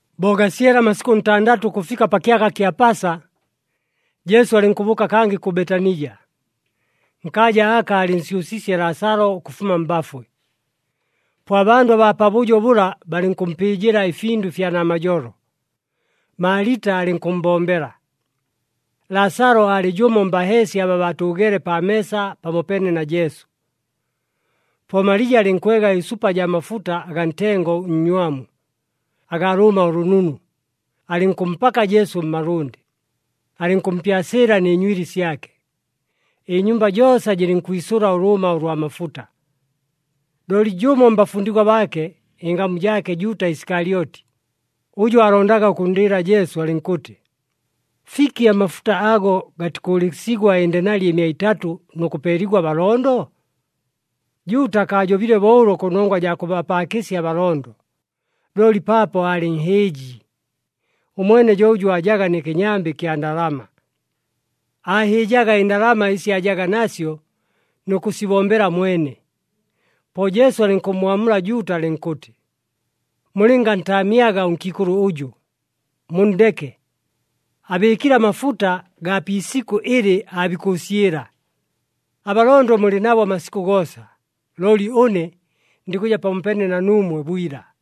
Bo gasyele amasikʉ ntandatʉ ʉkʉfika pa kyaka kya Pasa, Jesu alɨnkʉbʉʉka kangɨ kʉ Betanija, nkaaja aka aalɨnsyʉsiisye Laasalo ʉkʉfuma mbafwe. Po abandʉ abaa pabʉjo bʉla balɨnkʉmpɨɨjɨla ɨfindʉ ɨfya namajolo. Maalita alɨnkʉmmbombela. Laasalo aalɨ jʉmo mbaheesya aba baatʉʉgeele pa meesa pamopeene na Jesu. Po Malija alɨnkwega ɨsupa jaa mafuta agaa ntengo ʉnnywamu, agaa lʉʉma ʉlʉnunu, alɨnkʉmpaka Jesu mmalʉndɨ, alɨnkʉmpyasɨɨla nɨ nywili syake. Ɨnyumba joosa jɨlɨnkwisʉla ʉlʉʉma ʉlwa mafuta. Looli jʉmo mbafundigwa baake ɨngamu jaake Juuta Isikalyoti, ʉjʉ aalondaga ʉkʉnndɨɨla Jesu, alɨnkʉtɨ, “Fiki amafuta ago gatikʉʉlɨsigwa ɨndenali ɨmia itatʉ nʉ kʉpeeligwa abalondo?” Juuta akaajobile bo ʉlo kʉnongwa jaa kʉbapaakɨsya abalondo, looli paapo aalɨ nhɨɨji. Ʉmwene jo ʉjʉ aajaga nɨ kɨnyambɨ ɨkya ndalama. Aahɨɨjaga ɨndalama ɨsi aajaga nasyo nʉ kʉsibombela mwene. Po Jesu alɨnkʉmmwamula Juuta alɨnkʉtɨ, “Mulɨngantaamyaga ʉnkiikʉlʉ ʉjʉ, munndeke, abɨɨkile amafuta gaa pi isikʉ ɨlɨ aabikʉʉsyɨla. Abalondo mulɨ nabo amasikʉ goosa. Looli ʉne ndikʉja pakʉja pamopeene na nuumwe bwila.”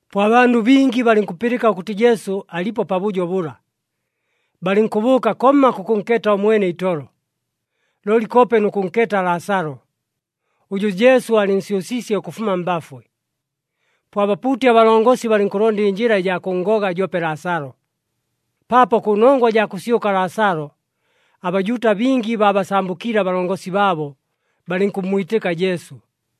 Po abandʉ bingi balɨnkʉpɨlɨka ʉkʉtɨ Jesu alipo pabʉjo bʉla, balɨnkʉbʉʉka komma kʉkʉnkeeta ʉmwene itolo, looli koope nʉ kʉnkeeta Laasalo, ʉjʉ Jesu aalɨnsyʉsiisye ʉkʉfuma mbafwe. Po abapuuti abalongosi balɨnkʉlonda ɨnjɨla ɨjaa kʉnngoga joope Laasalo, paapo kʉnongwa jaa kʉsyʉka Laasalo, aBajuuta bingi baabasambʉkiile abalongosi baabo, balɨnkʉmmwitɨka Jesu.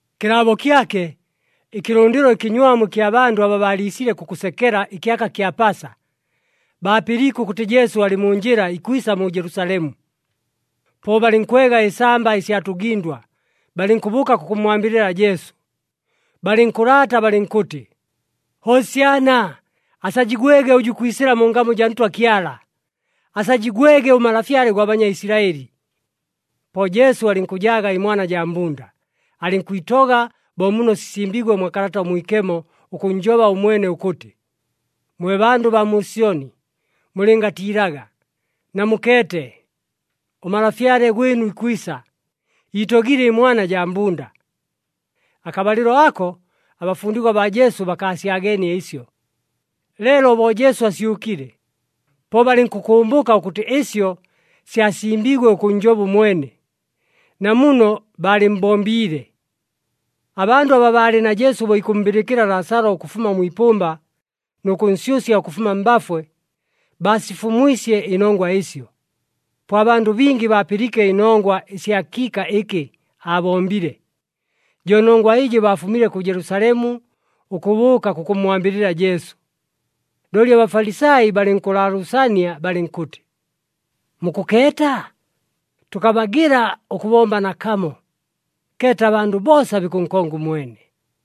Kɨlaabo kyake, ɨkɨlʉndɨlo ɨkɨnywamu ɨkya bandʉ aba baaliisile kʉkʉsekela ɨkyaka kya Pasa, baapɨliike ʉkʉtɨ Jesu alɨ mu njɨla ikwisa mu Jelusalemu. Po balɨnkwega ɨsamba ɨsya tʉgɨndwa, balɨnkʉbʉʉka kʉkʉmmwambɨlɨla Jesu. Balɨnkʉlaata balɨnkʉtɨ, “Hosyana! Asajigwege ʉjʉ ikwisɨla mu ngamu jaa Ntwa Kyala! Asajigwege ʉMalafyale gwa Banyaisilaɨli.” Po Jesu alɨnkʉjaaga ɨmwana jaa mbunda, alɨnkwitoga bo muno sisimbiigwe mwa Kalata ʉMwikemo ʉkʉnnjoba ʉmwene ʉkʉtɨ, “Mwe bandʉ baa mu Syoni, mulɨngatiilaga! Namukeete, ʉMalafyale gwɨnu ikwisa, iitogile ɨmwana jaa mbunda.” Akabalɨlo ako, abafundigwa baa Jesu bakaasyageenie ɨsyo. Leelo bo Jesu asyʉkile, po balɨnkʉkʉmbʉka ʉkʉtɨ ɨsyo syasimbiigwe ʉkʉnnjoba ʉmwene, na muno baalɨmmbombiile. Abandʉ aba baalɨ na Jesu bo ikʉmmbɨlɨkɨla Laasalo ʉkʉfuma mwi ipʉmba nʉ kʉnsyʉsya ʉkʉfuma mbafwe, baasifumwisye ɨnongwa ɨsyo. Po abandʉ bingi baapɨliike ɨnongwa ɨsya kiika ɨkɨ aabombile, jo nongwa ɨjɨ baafumile kʉ Jelusalemu ʉkʉbʉʉka kʉkʉmmwambɨlɨla Jesu. Looli aBafalisai balɨnkʉlaalʉʉsania balɨnkʉtɨ, “Mukʉkeeta? Tʉkabagɨla ʉkʉbomba nakamo! Keeta, abandʉ boosa bikʉnkonga ʉmwene.”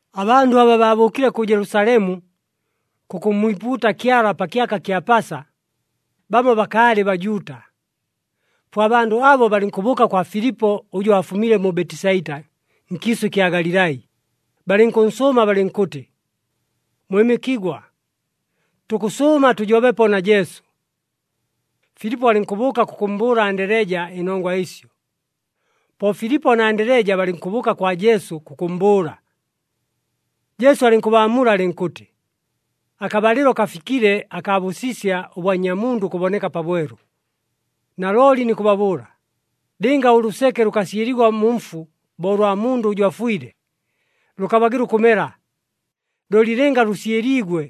Abandʉ aba baabʉʉkile kʉ Jelusalemu, kʉkʉmmwipuuta Kyala pa kyaka kya Pasa, bamo bakaalɨ Bajuuta. Po abandʉ abo balɨnkʉbʉʉka kwa Filipo ʉjʉ aafumile mu Betisaita nkiisʉ ɨkya Galilai, balɨnkʉnsʉʉma balɨnkʉtɨ, “Mwɨmɨkigwa, tukʉsʉʉma tʉjobepo na Jesu.” Filipo alɨnkʉbʉʉka kʉkʉmmbʉʉla Andeleja ɨnongwa ɨsyo, po Filipo na Andeleja balɨnkʉbʉʉka kwa Jesu kʉkʉmmbʉʉla. Jesu alɨnkʉbaamula alɨnkʉtɨ, “Akabalɨlo kafikile akaa bʉsisya ʉbwa Nnyamundʉ ʉkʉboneka pabwelu. Nalooli nikʉbabʉʉla, lɨnga ʉlʉseke lʉkasyɨligwa mu mfu bo ʉlwa mundʉ ʉjʉ afwile, lʉkabagɨla ʉkʉmela, looli lɨnga lʉsyɨliigwe,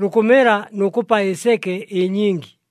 lukʉmela nʉ kʉpa ɨseke ɨnyingi.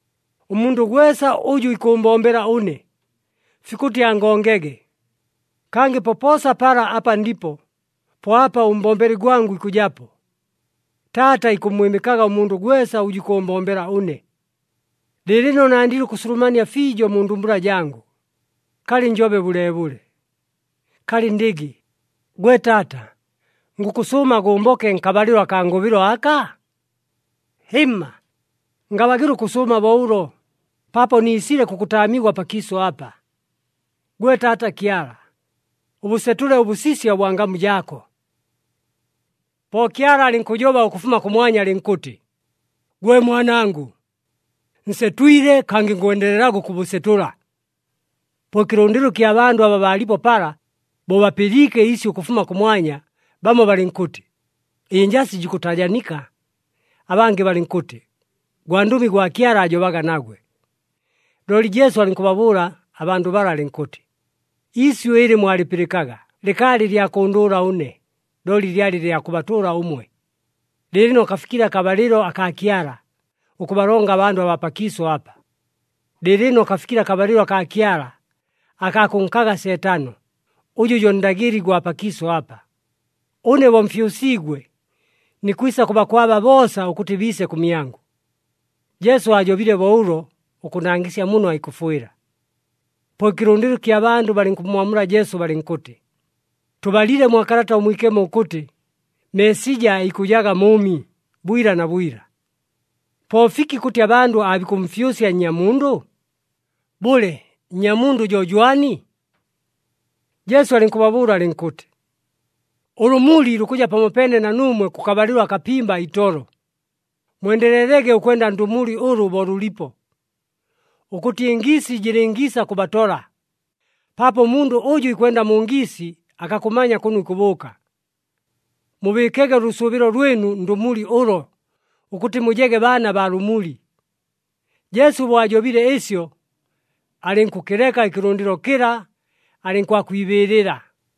Ʉmundʉ gwesa ʉjʉ ikʉʉmbombela ʉne, fikʉtɨ angongege. Kangɨ popoosa pala apa ndipo, po apa ʉmbombeli gwangʉ ikʉjapo. Taata ikʉmmwɨmɨkaga ʉmundʉ gwesa ʉjʉ ikʉʉmbombela ʉne. “Lɨɨlɨno nandile ʉkʉsulumania fiijo mu ndumbula jangʉ. Kalɨ njobe bʉleebʉle? Kalɨ ndɨgɨ, ‘Gwe Taata, ngʉkʉsʉʉma gʉmboke nkabalɨlo akaa ngʉbɨlo aka?’ Hɨmma, ngabagɨla ʉkʉsʉʉma bo ʉlo paapo niisile kʉkʉtaamigwa pakiisʉ apa. Gwe Taata Kyala, ʉbʉsetʉle ʉbʉsisya ʉbwa ngamu jaako.” Po Kyala alɨnkʉjoba ʉkʉfuma kʉmwanya alɨnkʉtɨ, “Gwe Mwanangʉ, nsetwile, kangɨ ngwendelelaga ʉkʉbʉsetʉla.” Po ɨkɨlʉndɨlo ɨkya bandʉ aba baalipo pala bo bapɨliike iisyʉ ʉkʉfuma kʉmwanya, bamo balɨnkʉtɨ, “Ɨnjasi jikʉtajanika,” abangɨ balɨnkʉtɨ, “Gwandʉmi gwa Kyala aajobaga nagwe.” Looli Jesu alɨnkʉbabʉʉla abandʉ bala alɨnkʉtɨ, “Iisyʉ ɨlɨ mwalɨpɨlɨkaga lɨkaalɨ lya kʉndʉʉla ʉne, looli lyalɨ lya kʉbatʉʉla ʉmwe. Lɨɨlɨno kafikile akabalɨlo akaa Kyala ʉkʉbalonga abandʉ abaa pakiisʉ apa. Lɨɨlɨno kafikile akabalɨlo akaa Kyala akaa kʉnkaga Seetano, ʉjʉ jo ndagɨli gwa pakiisʉ apa. Ʉne bo mfyʉsiigwe, nikwisa kʉbakwaba boosa ʉkʉtɨ biise kʉmyangʉ.” Jesu aajobile bo ʉlo, ʉkʉnangɨsya muno aikʉfwɨla. Po ɨkɨlʉndɨlo ɨkya bandʉ balɨnkʉmmwamula Jesu balɨnkʉtɨ, “Tʉbalile mwa Kalata ʉMwikemo ʉkʉtɨ, Meesija aikʉjaga mʉʉmi bwila na bwila. Po fiki kʉtɨ abandʉ aabikʉmfyʉsya Nnyamundʉ? Bʉle, Nnyamundʉ jo jwani?” Jesu alɨnkʉbabʉʉla alɨnkʉtɨ, “Ʉlʉmuli lukʉja pamopeene na nuumwe kʉkabalɨlo akapimba itolo. Mwendelelege ʉkwenda ndʉmuli ʉlʉ bo lʉlipo, ʉkʉtɨ ɨngiisi jɨlɨngiisa kʉbatola, paapo ʉmundʉ ʉjʉ ikwenda mu ngiisi akakʉmanya kʉno ikʉbʉʉka. Mubɨɨkege ʉlʉsʉʉbɨlo lwɨnu ndʉmuli ʉlo ʉkʉtɨ mujege baana baa lʉmuli.” Jesu bo ajobile ɨsyo, alɨnkʉkɨleka ɨkɨlʉndɨlo kɨla, alɨnkwakwibɨɨlɨla.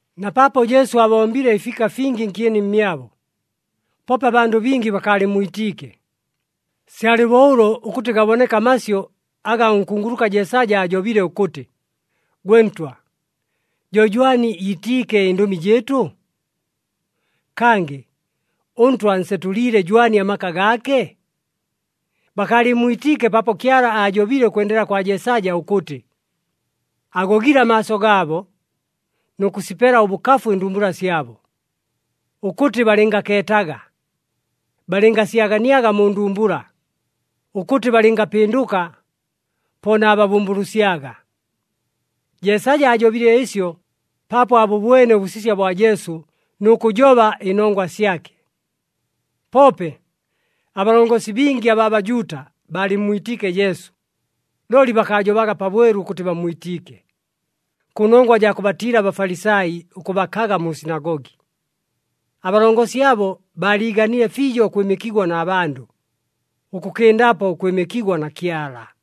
Na paapo Jesu aabombile ɨfiika fingi nkyeni mmyabo, poope abandʉ bingi bakaalɨmmwitiike. Syalɨ bo ʉlo ʉkʉtɨ gaboneke amasyʉ aga ʉnkunguluka Jeesaja aajobile ʉkʉtɨ, “Gwe Ntwa, jo jwani iitiike ɨndʉmi jɨɨtʉ? Kangɨ, ʉNtwa ansetʉliile jwani amaka gaake?” Bakaalɨmmwitiike paapo Kyala aajobile ʉkwendela kwa Jeesaja ʉkʉtɨ, “Agogile amaaso gaabo, nʉ kʉsipela ʉbʉkafu ɨndumbula syabo, ʉkʉtɨ balɨngakeetaga, balɨngasyaganiaga mu ndumbula, ʉkʉtɨ balɨngapɨndʉka, po naababʉmbʉlʉsyaga.” Jeesaja aajobile ɨsyo paapo aabʉbwene ʉbʉsisya bwa Jesu nʉ kʉjoba ɨnongwa syake. Poope, abalongosi bingi abaa Bajuuta baalɨmmwitiike Jesu, looli bakaajobaga pabwelu ʉkʉtɨ bammwitiike, kʉnongwa jaa kʉbatiila aBafalisai ʉkʉbakaga mu sinagogi. Abalongosi abo baaliiganile fiijo ʉkwɨmɨkigwa na bandʉ, ʉkʉkɨndapo ʉkwɨmɨkigwa na Kyala.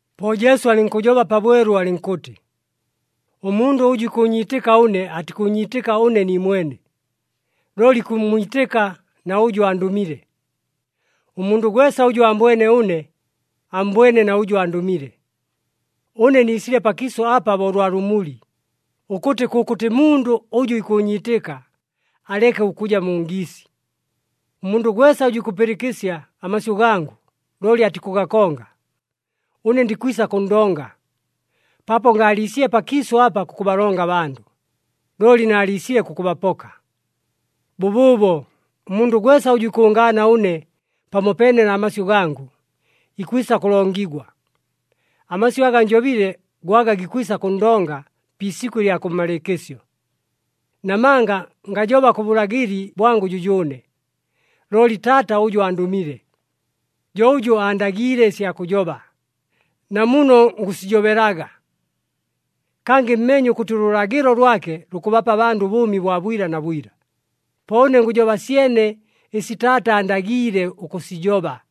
Po Jesu alɨnkʉjoba pabwelu alɨnkʉtɨ, “Ʉmundʉ ʉjʉ ikʉʉnyiitɨka ʉne, atikʉʉnyiitɨka ʉne niimwene, looli ikʉmmwitɨka na ʉjʉ andʉmile. Ʉmundʉ gwesa ʉjʉ aambwene ʉne, ammbwene na ʉjʉ andʉmile. Ʉne niisile pakiisʉ apa bo ʉlwa lʉmuli, ʉkʉtɨ kʉkʉtɨ mundʉ ʉjʉ ikʉʉnyiitɨka aleke ʉkʉja mu ngiisi. “Ʉmundʉ gwesa ʉjʉ ikʉpɨlɨkɨsya amasyʉ gangʉ, looli atikʉgakonga, ʉne ndikwisa kʉnndonga, paapo ngaaliisile pakiisʉ apa kʉkʉbalonga abandʉ, looli naaliisile kʉkʉbapoka. Bʉbʉʉbo ʉmundʉ gwesa ʉjʉ ikʉngaana ʉne pamopeene na masyʉ gangʉ ikwisa kʉlongigwa. Amasyʉ aga njobile go aga gikwisa kʉnndonga pi isikʉ ɨlya kʉmmalɨɨkɨsyo. Namanga ngajoba kʉ bʉlagɨli bwangʉ jʉjʉʉne, looli Taata ʉjʉ andʉmile, jo ʉjʉ aandagiile ɨsya kʉjoba, na muno ngʉsijobelaga. Kangɨ mmeenye ʉkʉtɨ ʉlʉlagɨlo lwake lukʉbapa abandʉ ʉbʉʉmi bwa bwila na bwila. Po ʉne ngʉjoba syene ɨsi Taata aandagiile ʉkʉsijoba.”